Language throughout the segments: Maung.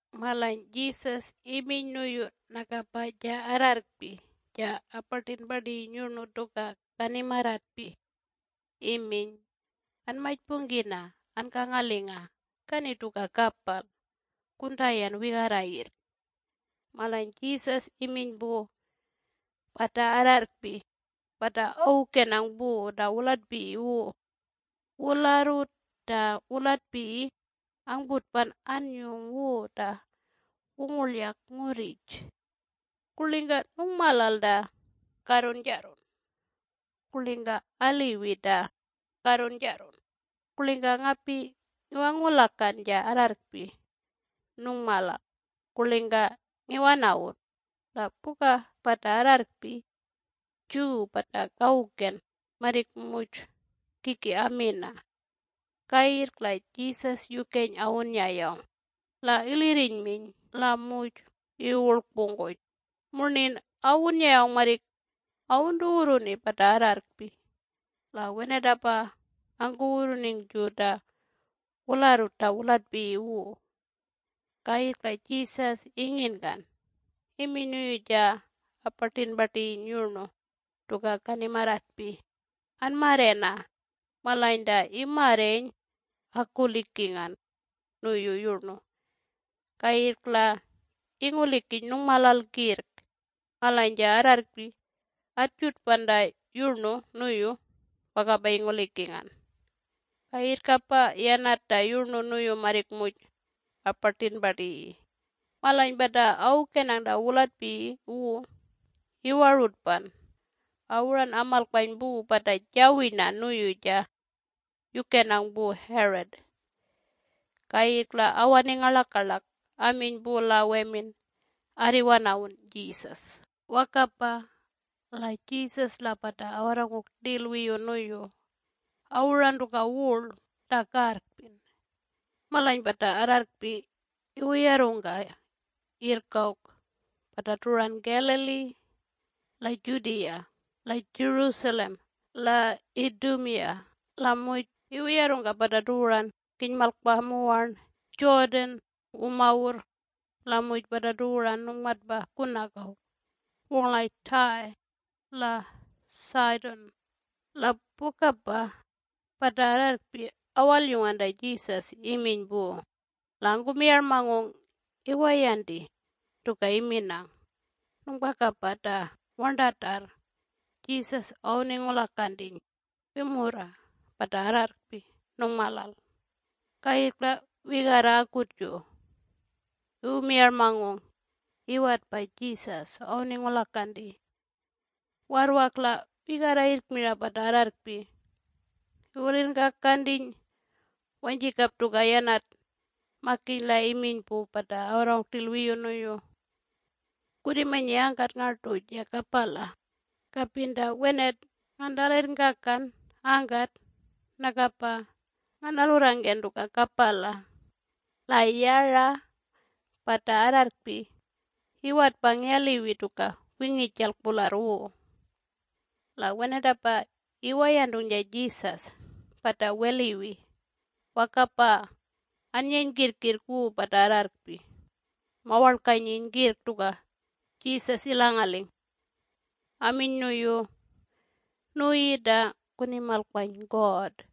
Malany Jesus iminy nuyu nakapa ja arrarrkpi ja apartipartiyi yurnu tuka kanimarratpi iminy, “Anmajpungkina ankangalinga kani tuka kapal kuntayan wigarra yirrk.” Malany Jesus iminy pu pata arrarrkpi pata awukenang pu ta wulatpiyi wu, “Wularrut ta wulatpiyi angputpan anyung wu ta wungurlyak ngurrij. Kurlingka nungmalal ta karrunjarrun? Kurlingka aliwi ta karrunjarrun? Kurlingka ngapi ngiwangulakan ja arrarrkpi nungmalal kurlingka ngiwanawun?” La puka pata arrarrkpi Jew pata kawuken marrik muj kiki amina. Kayirrk la Jesus yukeny awunnyayawng la ilirrinyminy la muj iwuwurlkpungkuny murnin awunnyayawng marrik awuntuwurruni pata arrarrkpi. La wenatapa angkuwurruningju ta wularrut ta wulatpiyi wu. Kayirrk la Jesus inginkan iminy nuyu ja apartipartiyi yurnu tuka kanimarratpi, “Anmarrena!” Malany ta imarreny akulikingan nuyu yurnu kayirrk la ingulikiny nungmalal kirrk. Malany ja arrarrkpi atjutpan ta yurnu nuyu wakapa ingulikingan. Kayirrkapa yanat ta yurnu nuyu marrik muj apartipartiyi. Malany pata awukenang ta wulatpiyi wu iwarutpan awuran amalkpany pu pata jawirna nuyu ja yukenang pu Herod. Kayirrk la awaning ngarlakarlak aminy pu la wemin, “Arriwanawun Jesus.” Wakapa la Jesus la pata awarrangung rtil wiyu nuyu awuran tuka wurl ta karrkpin. Malany pata arrarrkpi iwuyarrungka yirrk awk pata tuwuran Galilee la Judea la Jerusalem la Idumea la muj iwuyarrungka pata tuwuran kinymalkpa muwarn Jordan wumawurr la muj pata tuwuran nungmatpa kunak awk wungurlaj Tyre la Sidon. La pukapa pata arrarrkpi awalyungan ta Jesus iminy pu la angkumiyarmangung iwayanti tuka iminang. Nungpakapa ta warntatarr Jesus awuningulakantiny wimurra pata arrarrkpi nungmalal. Kayirrk la wigarra akutju iwumiyarmany iwetpa Jesus awuningulakanti. Warrwak la wigarra yirrk mira pata arrarrkpi iwulirrngkakantiny wanyjikap tuka yanat, makiny la iminy pu pata awarrangung rtil wiyu nuyu, “Kurrimanyi angkat ngartu ja kapala. Kapin ta wenat ngantalirrngkakan angkat nakapa nganalurrangken tuka kapala.” La yara pata arrarrkpi iwatpang yaliwi tuka wingijalk pularr wu. La wenatapa iwayantung ja Jesus pata weliwi wakapa anyeny kirrkirrk wu pata arrarrkpi mawarlkanyiny kirrk tuka Jesus ilangaling, aminy nuyu, “Nuyi ta kunimalkpany God.”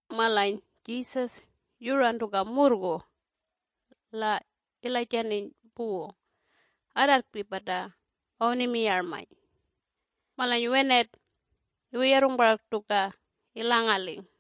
Malany Jesus yuran tuka murrgu la ilajantiny pu arrarrkpi pata awunimiyarmany. Malany wenat iwuyarrung parak tuka ilangaling.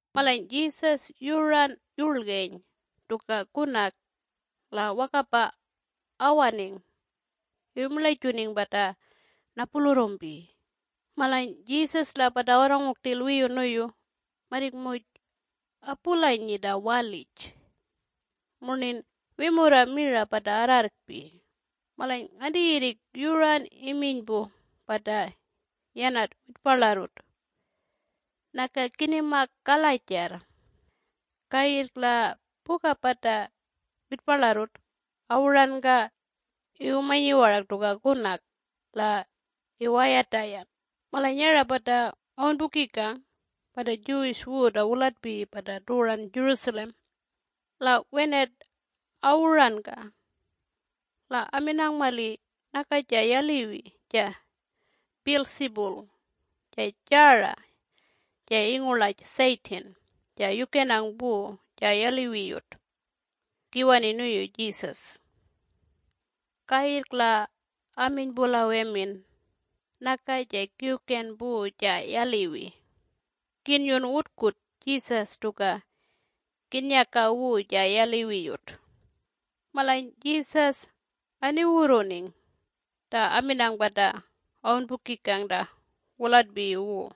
Malany Jesus yuran yurlgeny tuka kunak la wakapa awaning iwumirlajuning pata napulurrumpi. Malany Jesus la pata awarrangung rtil wiyu nuyu marrik muj apulanyi ta walij - murnin wimurra mira pata arrarrkpi. Malany nganti yirrik yuran iminy pu pata yanat witparlarrut, “Naka kinima kalajarr.” Kayirrk la puka pata witparlarrut awuranka iwumanyi warak tuka kunak la iwayatayan. Malany yara pata awunpukikang pata Jews wu ta wulatpiyi pata tuwuran Jerusalem. La wenat awuranka la aminang mali naka ja yaliwi ja Beelzebul ja jara ja ingurlaj Satan ja yukenang pu ja yaliwiyut kiwani nuyu Jesus. Kayirrk la aminy pu la wemin, “Naka ja Kiwken pu ja yaliwi kinnyun wutkut Jesus tuka kinnyaka wu ja yaliwiyut.” Malany Jesus aniwurruning ta aminang pata awunpukikang ta wulatpiyi wu.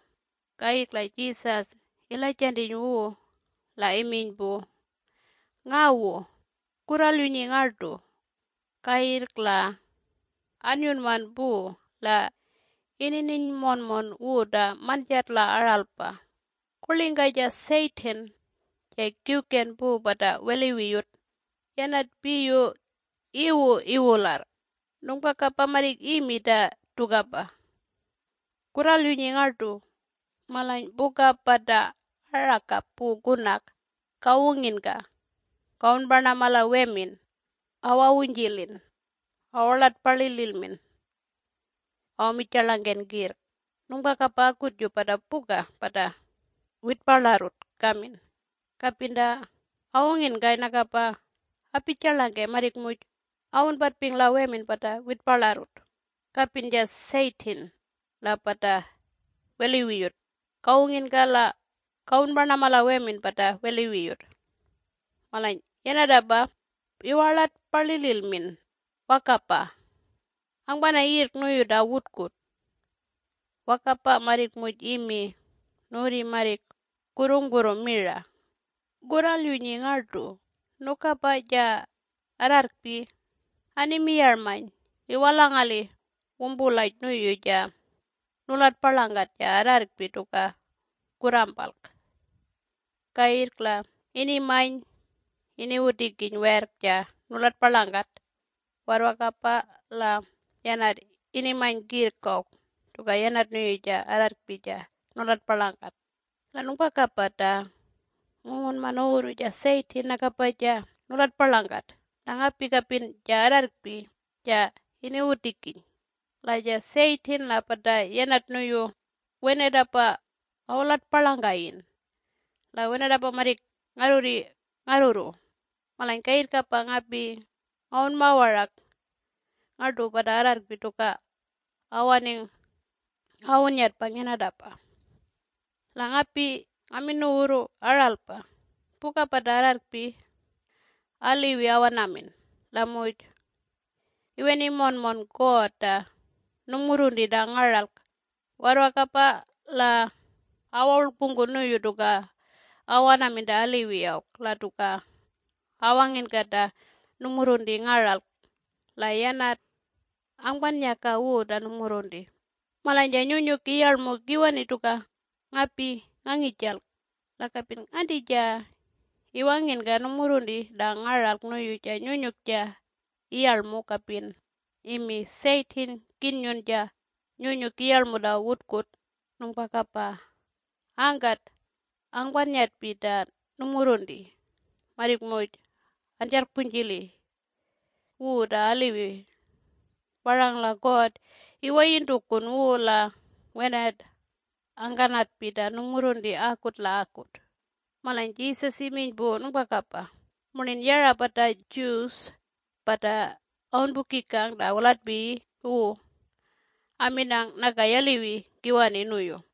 Kayirrk la Jesus ilajantiny wu la iminy pu, “Ngawu! Kurralyunyi ngartu!” Kayirrk la anyunman pu la inininy monmon wu ta manjat la aralpa, “Kurlingka ja Satan ja kiwken pu pata weliwiyut, yanat piyu iwu iwularr? Nungpakapa marrik imi ta tukapa. Kurralyunyi ngartu! Malany puka pata arakap pu kunak kawunginka kawunparnama la wemin awawunjilin awarlartpalililmin awamirtjilingken kirrk. Nungpakapa akutju pata puka pata witparlarrut kamin, kapin ta awunginkay nakapa apijarlangkey marrik muj awunpatping la wemin pata witparlarrut. Kapin ja Satan la pata weliwiyut kawunginka la kawunparnama la wemin pata weliwiyut, malany yanatapa iwarlartpalililmin wakapa angpana yirrk nuyu ta wutkut! Wakapa marrik muj imi. Nuwurri marrik kurrungpurru mira.” Kurralyunyi ngartu! Nukapa ja arrarrkpi animiyarmany iwalangali wumpulaj nuyu ja nulatparlangat ja arrarrkpi tuka kurrampalk. Kayirrk la inimany iniwutikiny werrk ja nulatparlangkat warrwakapa la yanat inimany kirrk awk tuka yanat nuyu ja arrarrkpi ja nulatparlangkat. La nungpakapa ta ngungunma nuwurru ja Satan nakapa ja nulatparlangkat la ngapi kapin ja arrarrkpi ja iniwutikiny. La ja Satan la pata yanat nuyu wenatapa awulatparlangkayin la wenatapa marrik ngarrurri ngarrurru. Malany kayirrkapa ngapi ngawunma warak ngartu pata arrarrkpi tuka awaning awunnyatpang yanatapa. La ngapi ngamin nuwurru aralpa! Puka pata arrarrkpi aliwi awanamin la muj iwanini monmon God ta nungmurrunti ta ngaralk warrwakapa la awawurlkpungku nuyu tuka awanamin ta aliwi awk la tuka awanginka ta nungmurrunti ngaralk la yanat angpanyaka wu ta nungmurrunti. Malany ja Nyunyuk Iyarlm kiwani tuka ngapi ngangijalk. La kapin nganti ja iwanginka nungmurrunti ta ngaralk nuyu ja Nyunyuk ja Iyarlmu kapin imi, ‘Satan kinnyun ja Nyunyuk Iyarlmu ta wutkut’, nungpakapa angkat angkanatpi ta nungmurrunti marrik muj anjarrkpujili wu ta aliwi parang la God iwayintukun wu la wenat angkanatpi ta nungmurrunti akut la akut. Malany Jesus iminy pu nungpakapa murnin yara pata Jews pata awunpukikang ta wulatpiyi wu aminang naka yaliwi kiwani nuyu.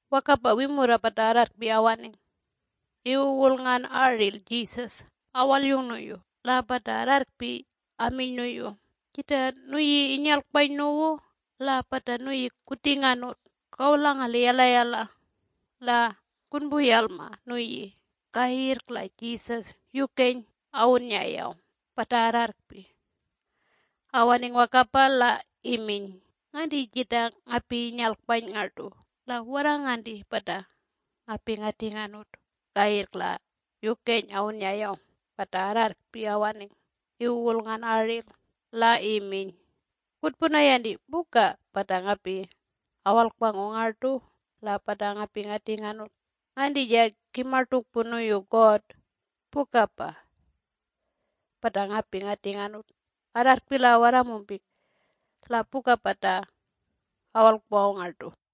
Wakapa wimurra pata arrarrkpi awaning iwuwurlngan aril Jesus awalyung nuyu. La pata arrarrkpi aminy nuyu, “Jita nuyi inyalkpany nuwu la pata nuyi kutinganut kawulangali yalayala la kunpuyalma nuyi.” Kayirrk la Jesus yukeny awunnyayawng pata arrarrkpi awaning wakapa la iminy, “Nganti jita ngapi inyalkpany ngartu la warra nganti pata ngapi ngatinganut?” Kayirrk la yukeny awunnyayawng pata arrarrkpi awaning iwuwulngan aril la iminy, “Kutpunayanti puka pata ngapi awalkpangung ngartu la pata ngapi ngatinganut. Nganti ja kimartukpun nuyu God pukapa pata ngapi ngatinganut arrarrkpi la warramumpik la puka pata awalkpangung ngartu”.